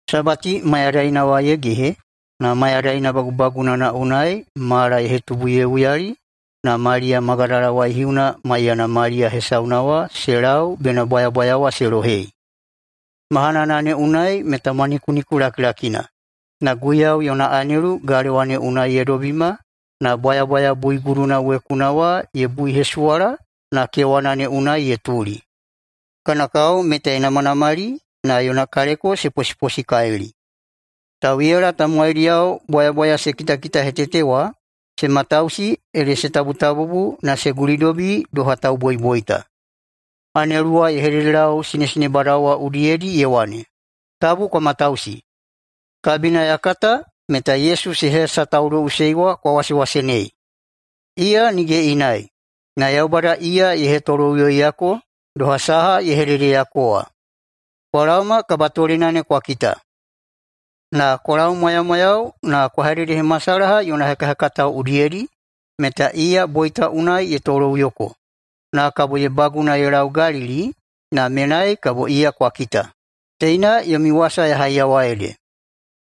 Sabati mayadaina wa ye gehe na mayadaina bagubagunana unai mala ye hetubu ye uyali na Maliya Magadala waihiuna maiyana Maliya hesauna wa se lau bena bwayabwaya wa se lohei. Mahanana ne unai meta mwanikuniku lakilakina, na Guiyau yona anelu galewa ne unai ye dobima na bwayabwaya buiguduna wekuna wa ye buihesuwala na kewana ne unai ye tuli. Kana kao meta ye namanamali na yona kaleko se posiposikalili. Tauꞌiyala tamowaidiyao bwayabwaya se kitakitahetete wa se matausi ede se tabutabubu na se gulidobi doha tauboiboita. Anelu wa ye hededelau sinesinebadao wa udiyedi ye wane, “Tabu kwa matausi! Kabina ya kata meta Yesu se hesatauloꞌusei wa kwa wasewasenei. Iya nige inai, na Yaubada iya ye hetoloꞌuyoiyako, doha saha ye hededeyako wa. Kwa laoma kabatolena ne kwa kita. Na kwa laumwayamwayau na kwa hededehemasalaha yona hekahekatao udiyedi meta iya boita unai ye toloꞌuyoko, na kabo ye baguna ye lau Galili na menai kabo iya kwa kita. Teina yomi wasa ya haiyawa ede.”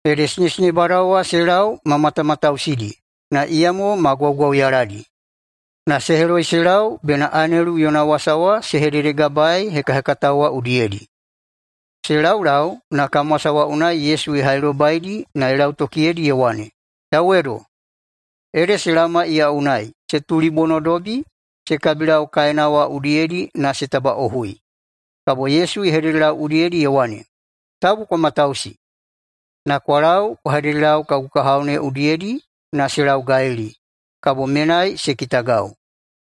Ede sinesinebadao wa se lau ma matamatausidi na iyamo ma gwaugwauyaladi, na se heloi se lau bena anelu yona wasa wa se hededegabaei hekahekatao wa udiyedi. Se laulau na kamwasa wa unai Yesu ye hailobaidi na ye lautokiyedi ye wane, “Yauwedo!” Ede se laoma iya unai, se tulibonodobi, se kabilau kaena wa udiyedi na se tabaꞌohui. Kabo Yesu ye hededelau udiyedi ye wane, “Tabu kwa matausi! Na kwa lau kwa hededelau kagu kahao ne udiyedi na se lau Galili, kabo menai se kitagau.”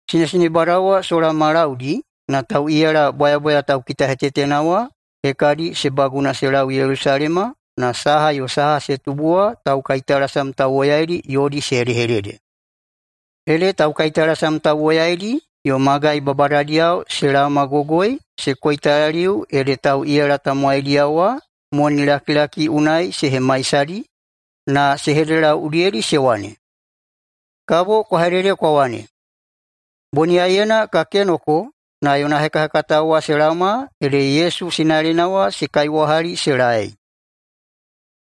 Sinesinebadao wa sola ma laudi na tauꞌiyala bwayabwaya taukitahetetena wa hekadi se baguna se lau Yelusalema na saha yo saha se tubu wa taukaitalasam tauwoyaidi yodi se hedehedede. Ede taukaitalasam tauwoyaidi yo magai babadadiyao se laomagogoi se koitalaliu ede tauꞌiyala tamowaidiyao wa monilakilaki unai se hemaisadi na se hededelau udiyedi se wane, “Kabo kwa hedede kwa wane, ‘Boniyaiyena ka kenoko na yona hekahekatao wa se laoma ede Yesu sinalena wa se kaiwahali se laei.’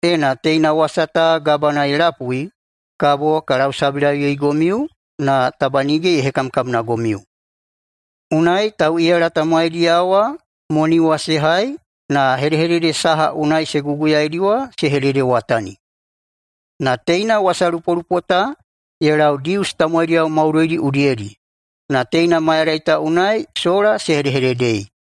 Ena teina wasa ta Gabana ye lapui kabo ka lausabilauyeigomiu na taba nige ye hekamkamnagomiu.” Unai tauꞌiyala tamowaidiyao wa moni wa se hai na hedehedede saha unai se guguyaidi wa se hededewatanidi. Na teina wasalupolupo ta ye lau Dius tamowaidiyao maudoidi udiyedi, na teina mayadai ta unai sola se hedehededei.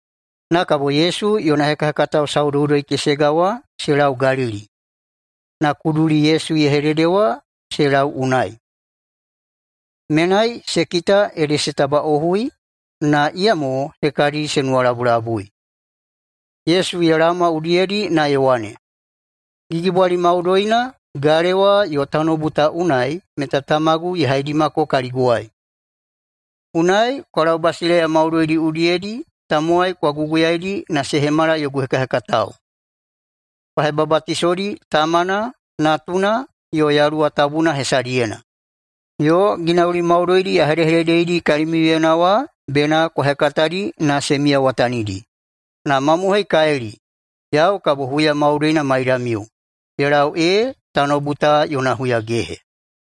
Na kabo Yesu yona hekahekatao saudoudoi-kesega wa se lau Galili, na kuduli Yesu ye hedede wa se lau unai. Menai se kita ede se tabaꞌohui, na iyamo hekadi se nuwalabulabui. Yesu ye laoma udiyedi na ye wane, “Gigibwali maudoina galewa yo tanoubu ta unai meta Tamagu ye haidimako kaliguwai. Unai kwa lau basileiya maudoidi udiyedi tamowai kwa guguyaidi na se hemala yogu hekahekatao. Kwa hebabatisoidi Tamana, Natuna yo Yaluwa Tabuna hesadiyena, yo ginauli maudoidi ya hedehededeidi kalimiuyena wa bena kwa hekatadi na se miyawatanidi. Na mamohoikalili, yau kabo huya maudoina maidamiu, ye lau ee tanoubu ta yona huyagehe.”